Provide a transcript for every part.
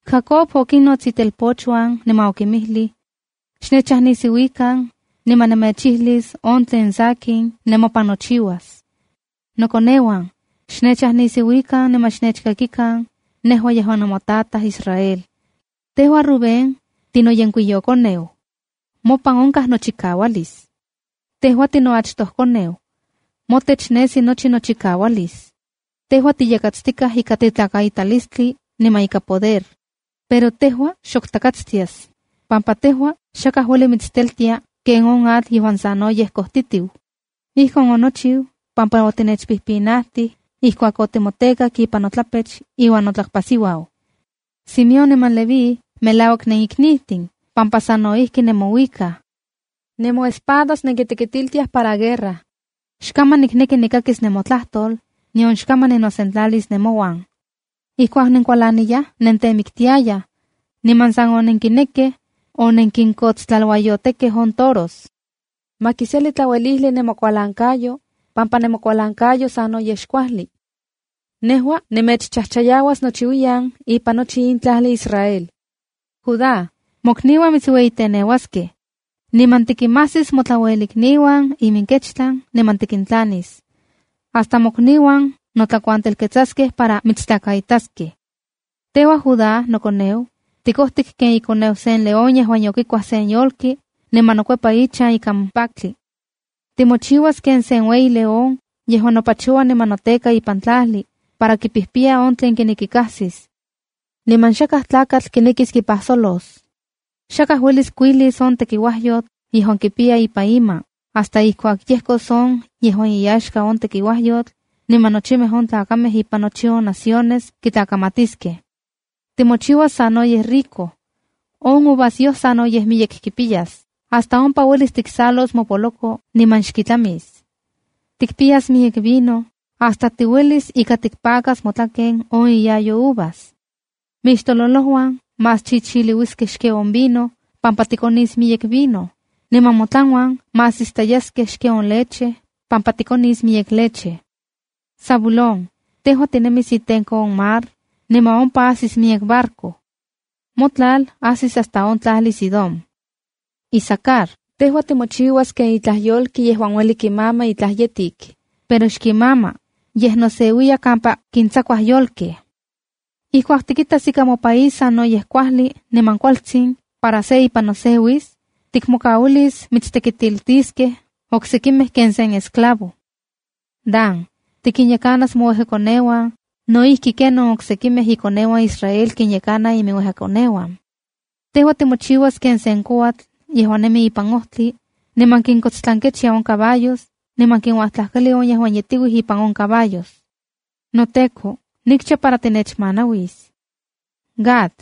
Jacob okinnots itelpochuan niman okinmijlij: “Xnechajnisiuikan, niman nemechijlis on tlen sakin nemopan nochiuas. ’Nokoneuan, xnechajnisiuikan niman xnechkakikan, nejua yejuan nemotataj Israel. ’Tejua Rubén, tinoyenkuiyokoneu. Mopan onkaj nochikaualis. Tejua tinoachtokoneu. Motech nesi nochi nochikaualis. Tejua tiyatkatstikaj ika tetlakaitalistli niman ika poder. Pero tejua xok takatstias, pampa tejua xakaj ueli mitsteltia ken on atl yejuan sanoyej kojtitiu. Ijkon onochiu pampa otinechpijpinajtij ijkuak otimotekak ipan notlapech iuan notlakpasiuau. ’Simeón niman Leví melauak neniknijtin pampa sa no ijki nemouikaj. Nemoespadas nenkitekitiltiaj para guerra. ¡Xkaman nikneki nikakis nemotlajtol, nion xkaman ninosentlalis nemouan! Ijkuak nenkualaniyaj nentemiktiayaj, niman san onenkinekej onenkinkotstlaluayotekej on toros. ¡Ma kiseli tlauelijli nemokualankayo, pampa nemokualankayo sanoyej xkuajli! ¡Nejua nemechchajchayauas nochiuiyan ipan nochi in tlajli Israel! ’Judá, mokniuan mitsueyiteneuaskej. Niman tikinmajsis motlauelikniuan iminkechtlan niman tikintlanis. Hasta mokniuan notlakuantelketsaskej para mitstlakaitaskej. Tejua Judá nokoneu, tikojtik ken ikoneu sen león yejuan yokikuaj sen yolki niman nokuepa ichan ikan paktli. Timochiuas ken sen ueyi león yejuan nopachoua niman noteka ipan tlajli, para kipijpiya on tlen kineki kajsis. Niman xakaj tlakatl kinekis kipajsolos. Xakaj uelis kuilis on tekiuajyotl yejuan kipiya ipan ima hasta ijkuak yejkos on yejuan iyaxka on tekiuajyotl, niman nochimej on tlakamej ipan nochi naciones kitlakamatiskej. Timochiuas sanoyej rico. On uvasyoj sanoyej miyek tikpiyas hasta uelis ompa tiksalos mopoloko niman xkitlamis. Tikpiyas miyek vino hasta tiuelis ika tikpakas motlaken on iyayo uvas. Mixtololojuan más chichiliuiskej xken on vino pampa tikonis miyek vino, niman motlanuan más istayaskej xken on leche pampa tikonis miyek leche. ’Zabulón, tejua tinemis itenko on mar, niman ompa ajsis miyek barco. Motlal ajsis hasta on tlajli Sidón. ’Isacar, tejua timochiuas ken itlaj yolki yejuan ueli kimama itlaj yetik, pero xkimama, yej noseuiya kampa kintsakuaj yolkej. “Ijkuak tikitas ika mopaís sanoyej kuajli niman kualtsin para se ipan noseuis, tikmokauilis mitstekitiltiskej oksekimej ken sen esclavo. ’Dan, tikinyekanas mouejkakoneuan no ijki ken on oksekimej ikoneuan Israel kinyekanaj iminuejkakoneuan. Tejua timochiuas ken sen kouatl yejuan nemi ipan ojtli, niman kinkotstlankechia on caballos niman kinuajtlajkali on yejuan yetiuij ipan on caballos. ’¡NoTEKO, nikcha para tinechmanauis! ’Gad,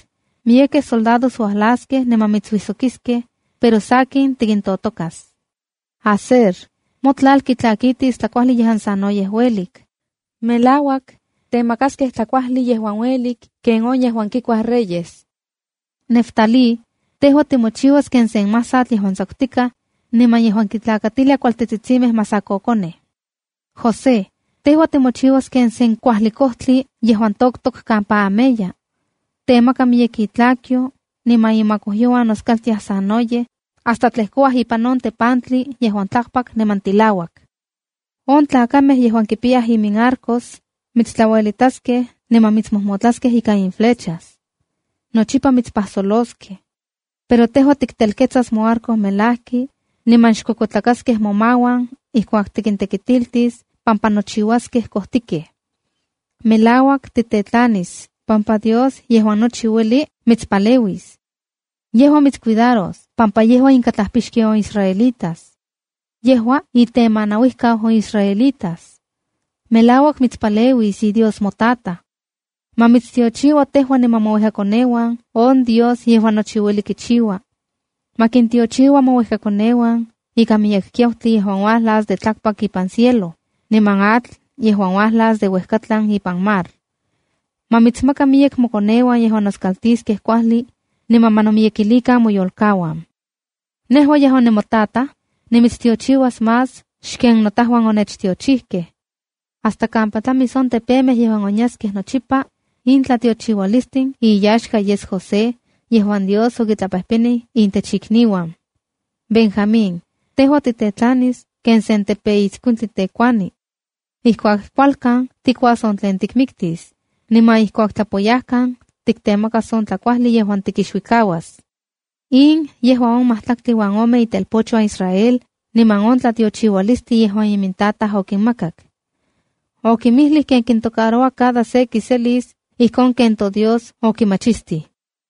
miyekej soldados uajlaskej niman mitsuijsokiskej, pero sakin tikintotokas. ’Aser, motlal kitlakitis tlakuajli yejuan sanoyej uelik. Melauak, temakaskej tlakuajli yejuan uelik ken on yejuan kikuaj reyes. ’Neftalí, tejua timochiuas ken sen masatl yejuan xtsakutikaj, niman yejuan kintlakatilia kualtetsitsimej masakokonej. ’José, tejua timochiuas ken sen kuajli kojtli yejuan toktok kampa ameya. Temaka miyek itlakyo niman imakojyouan noskaltiaj sanoyej hasta tlejkoua ipan on tepantli yejuan tlakpak niman tilauak. On tlakamej yejuan kipiyaj iminarcos mitstlauelitaskej niman mitsmojmotlaskej ikan imintlaminaluan. Nochipa mitspajsoloskej. Pero tejua tikteketsas moarco melajki, niman xkuekuetlakaskej momauan ijkuak tikintekitiltis pampa nochiuaskej kojtikej. Melauak, titetlanis pampa Dios Yejuan Nochi Ueli mitspaleuis. Yejua mitscuidaros pampa yejua inkatlajpixki on israelitas. Yejua itemanauijkau on israelitas. Melauak, mitspaleuis iDios motataj. Ma mitstiochiua tejua niman mouejkakoneuan on Dios Yejuan Nochi Ueli Kichiua. Ma kintiochiua mouejkaoneuan ika miyek kiautli yejuan uajlas de tlakpak ipan cielo, niman atl yejuan uajlas de uejkatlan ipan mar. Ma mitsmaka miyek mokoneuan yejuan noskaltiskej kuajli, niman ma nomiyekilikan moyolkauan. Nejua yejuan nimotataj, nimitstiochiuas más xken notajuan onechtiochijkej. Hasta kampa tlamis on tepemej yejuan onyaskej nochipa, in tlatiochiualistin iyaxka yes José yejuan Dios okitlapejpenij intech ikniuan. ’Benjamín, tejua titetlanis ken sen tepeitskuintli tekuani. Ijkuak kualkan tikuas on tlen tikmiktis, niman ijkuak tlapoyajkan tiktemakas on tlakuajli yejuan tikixuikauas.” In yejua on majtlaktli uan ome itelpochuan Israel niman on tlatiochiualistli yejuan imintataj okinmakak. Okimijlij ken kintocaroua cada se kiselis ijkon ken toDios okimachistij.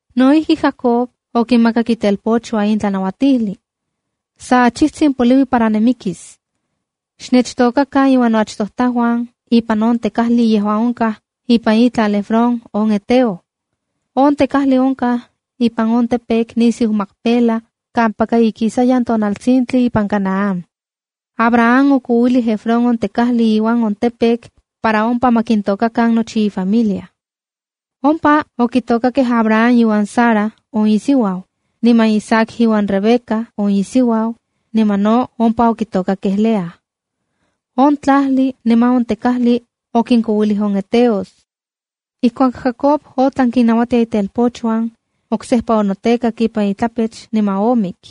No ijki, Jacob okinmakak itelpochuan in tlanauatijli: “Sa achijtsin poliui para nimikis. Xnechtokakan iuan noachtojtajuan ipan on tekajli yejuan onkaj ipan itlal Efrón on heteo. On tekajli onkaj ipan on campo nisiu Macpela kampaka ikisayan tonaltsintli ipan Canaán. Abraham okouilijka Efrón on tekajli iuan on campo para ompa ma kintokakan nochi ifamilia. Ompa okitokakej Abraham iuan Sara on isiuau, niman Isaac iuan Rebeca on isiuau, niman no ompa oniktokak Lea. On tlajli niman on tekajli okinkouilij on heteos.” Ijkuak Jacob otlan kinnajnauatia itelpochuan, oksejpa onotekak ipan itlapech niman omik.